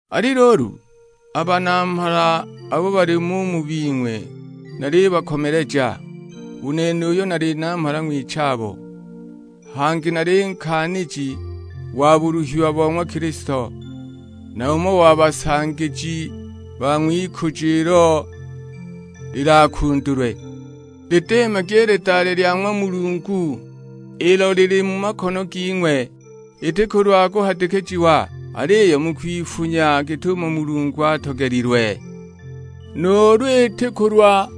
Ali luulu, a banamhala abo balimo u mu bing'we nalibakomeleja, u nene uyo nali namhala ng'wichabo; hangi nali nkaaniji wa buluhiwa bo ng'wa Kilisto, na umo wa basangiji ba ng'wikujo ilo lilakundulwe. Lidiimagi i lidale lya ng'wa Mulungu, ilo lili mu makono ging'we. Iti kulwa kuhadikijiwa, aliyo mu kwifunya git'umo Mulungu atogelilwe. Nuulu iti kulwa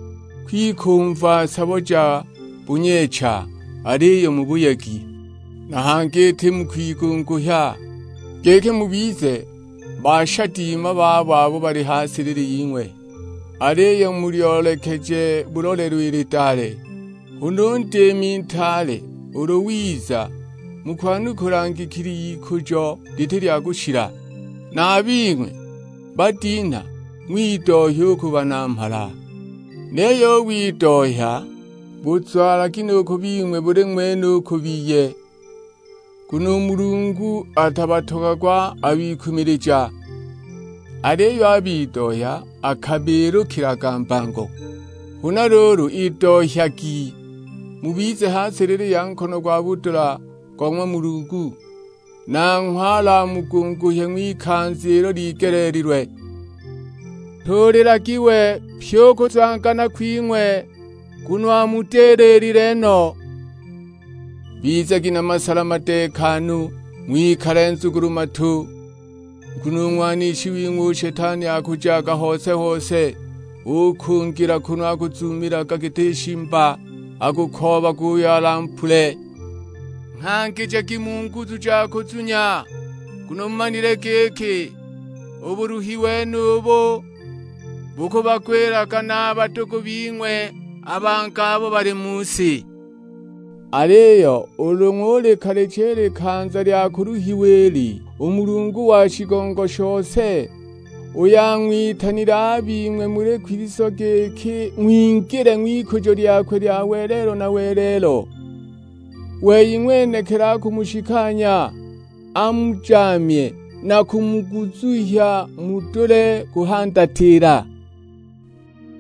kwikumva sabo ja bunyeecha, aliyo mu buyegi. Na hangi iti mu kwigunguhya, giki mubize bashadima babo abo bali ha silili ying'we, aliyo mulyoolekeje bulolelo i lidale. Huna u Ndiimi Ntaale ulu wiza mukwanukula ngikili y'ikujo liti lya kushila. Na a bing'we badinha ng'widohya u ku banamhala, niyo u widohya buzwalagi nu ku bing'we buli ng'wene u ku biye. Nguno u Mulungu atabatogagwa a bikumilija, aliyo a bidohya akabiilukilaga mbango. Huna luulu idohyagi, mubize ha silili ya nkono gwa budula go ng'wa Mulungu, nanghwe alamugunguhye ng'wikanza ilo ligeleelilwe. Ntuulilagi we pyi u kuzwangana kwing'we, nguno amudililile no. Bizagi na masala madeekanu, ng'wikale nzugulu-matu; nguno u ng'wanishi wing'we u Shetani akujaga hose-hose ukungila kunu akuzuumilaga giti shimba, akukoobaga uyo alampule! Nghangijagi mu nguzu ja kuzunya, nguno mumanile giki u buluhi wenubu bukubagwilaga na a badugu bing'we a bangi abo bali mu si. Aliyo ulu ng'ulikalicha i likanza lya kuluhiwa ili, u Mulungu wa shigongo shose, uyo ang'witanile a bing'we muli Kilisto giki ng'wingile ng'wikujo lyakwe lya welelo na welelo, wei ng'wenekili akumushikanya, amujaamye na kumuguzuhya mudule kuhandatila.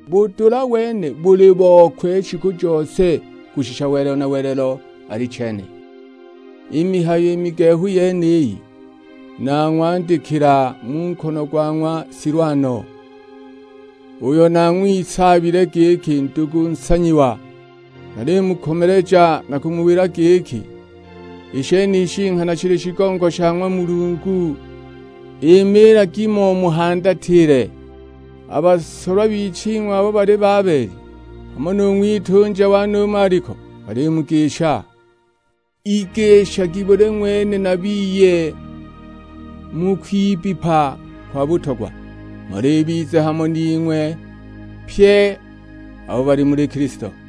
Budula wene buli bokwe shiku jose, kushisha welelo na welelo: Alichene. I mihayo i migehu yeniyi nang'wandikila mu nkono go ng'wa Silwano, uyo nang'wisaabile giki ndugu nsanyiwa; nalimukomeleja na kumuwila giki, i shenishi nghana shili shigongo sha ng'wa Mulungu, imiilagi mo muhandatile. A basolwa biching'wi abo bali Babeli, hamo nu ng'witunja wane u Maliko, balimugisha. Igishagi buli ng'wene na biye mu kwibbipa kwa butogwa. Mhola ibize hamo ning'we pye abo bali muli Kilisto.